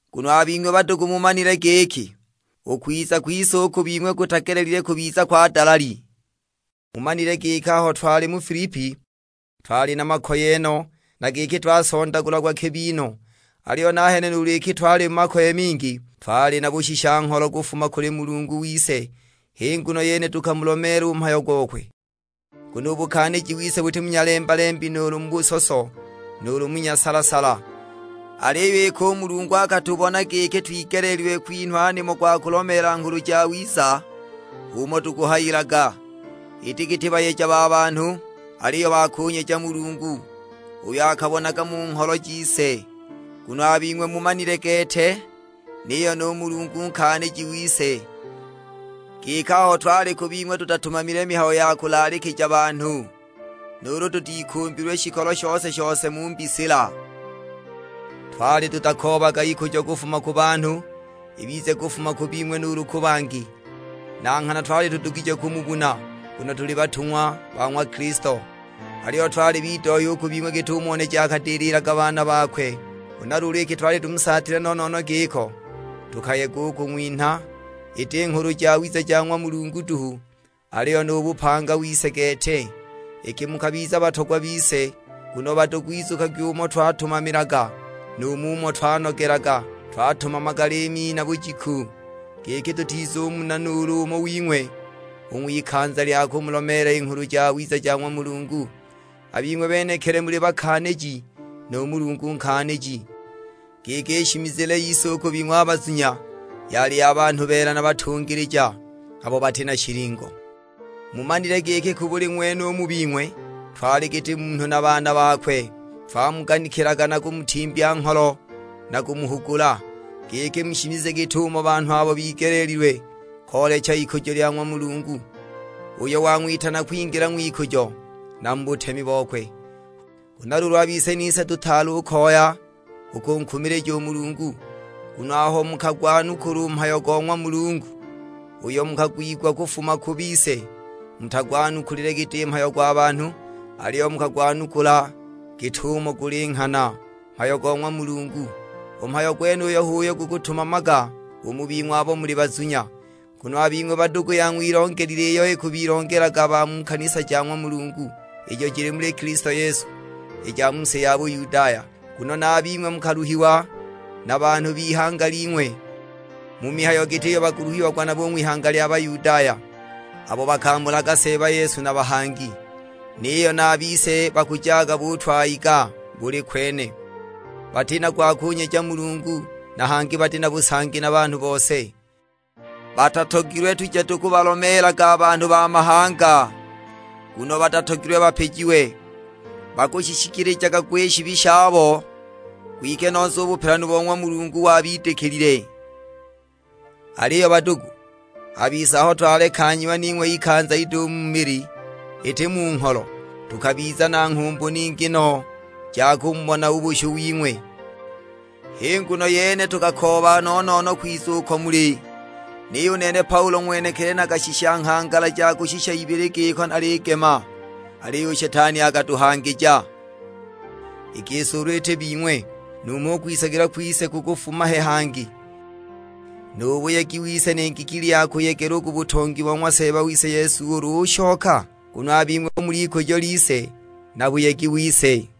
Nguno a bing'we badugu mumanile giki u kwiza kwise u ku bing'we kutagelelile kubiza kwa dalali. Mumanile giki aho twali mu Filipi twali na makoye no, na giki twasondagulagwa kibi no. Aliyo nahene nuulu iki twali mu makoye mingi, twali na bushisha-ngholo kufuma kuli Mulungu wise; h'i nguno yene tukamulomeela u mhayo gokwe. Nguno u buganikiji wise buti mu nyalemba-lembi nuulu mu busoso, nuulu mu nyasala-sala. Aliyo iki u Mulungu akatubona giki twigeleelilwe kwinhwa nimo gwa kulomeela Nghulu Jawiza, h'umo tukuhayilaga. Iti giti bayeja ba banhu, aliyo ba kunyeja Mulungu, uyo akabonaga mu ngholo jise. Nguno a bing'we mumanile gete, niyo nu Mulungu nkaaniji wise, giki aho twali ku bing'we tutatumamilile mihayo ya kulaalikija banhu, nuulu tutikumbilwe shikolo shose-shose mu mbisila. Twali tutakoobaga ikujo kufuma ku banhu, ibize kufuma ku bing'we nuulu ku bangi. Na nghana twali tudugije kumubuna, nguno tuli batung'wa ba ng'wa Kilisto. Aliyo twali bidohya u ku bing'we git'umo neji akadililaga baana bakwe. Huna luulu iki twali tumusaatilwe no-no-no giko, tukayega u kung'winha, iti Nghulu Jawiza ja ng'wa Mulungu duhu, aliyo nu bupanga wise gete, iki mukabiza batogwa bise. Nguno badugu izukagwi umo twatumamilaga, nu mumo twanogelaga; twatumamaga liimi na bujiku, giki tutizumuna nuulu umo wing'we, u ng'wikanza lya kumulomeela i Nghulu Jawiza ja ng'wa Mulungu. A bing'we benekili muli bakaaniji, nu Mulungu nkaaniji, giki i shimizile yise u ku bing'we a bazunya yali ya banhu beela na batungilija, abo bati na shilingo. Mumanile giki ku buli ng'wene u mu bing'we twali giti munhu na baana bakwe. Twamuganikilaga na kumutimbya ngholo na kumuhugula, giki mushimize giti banhu abo bigeleelilwe koolecha ikujo lya ng'wa Mulungu, uyo wang'witana kwingila ng'wikujo na mu butemi bokwe. Huna luulu a bise nise tutaali u koya u kunkumilija u Mulungu. Nguno aho mukagwanukula u mhayo go ng'wa Mulungu uyo mukagwigwa kufuma ku bise, mutagwanukulile giti mhayo gwa banhu, aliyo mukagwanukula git'umo guli nghana, mhayo go ng'wa Mulungu. U mhayo gwenuyo h'uyo gukutumamaga u mu bing'we abo muli bazunya. Nguno a bing'we badugu yang'wilongelile iyo ikubilongelaga ba mu kanisa ja ng'wa Mulungu, ijo jili muli Kilisto Yesu, i ja mu si ya Buyudaya. Nguno na a bing'we mukaluhiwa na banhu b'ihanga ling'we, mu mihayo giti iyo bakuluhiagwa nabo u ng'wihanga lya Bayudaya; abo bakamulaga Seeba Yesu na bahangi, niyo na a bise bakujaga butwayiga buli kwene. Bati na gwa kunyeja Mulungu, na hangi bati na busangi na banhu bose. Batatogilwe tuje tukubalomeelaga a banhu ba mahanga, nguno batatogilwe bapijiwe. Bakushishikilijaga gwa i shibi shabo; kwike nose u bupelanu bo ng'wa Mulungu wabidikilile. Aliyo badugu, a bise aho twalekanyiwa ning'we ikanza ido u mu mili, iti mu ngholo, tukabiza na nghumbu ningi no ja kumubona u bushu wing'we. H'i nguno yene tukakooba no-no-no kwiza uko muli; niyo u nene Paulo ng'wenekili nakashisha nghangala ja kushika ibili giko naligema, aliyo u Shetani akatuhangija. I gisi ulu iti bing'we, numho u kwisagilwa kwise kukufuma he hangi, nu buyegi wise ni ngikili ya kuyegela u ku butongi bo ng'wa Seeba wise Yesu ulu ushoka? Nguno a bing'we hu mul'ikujo lise, na buyegi wise.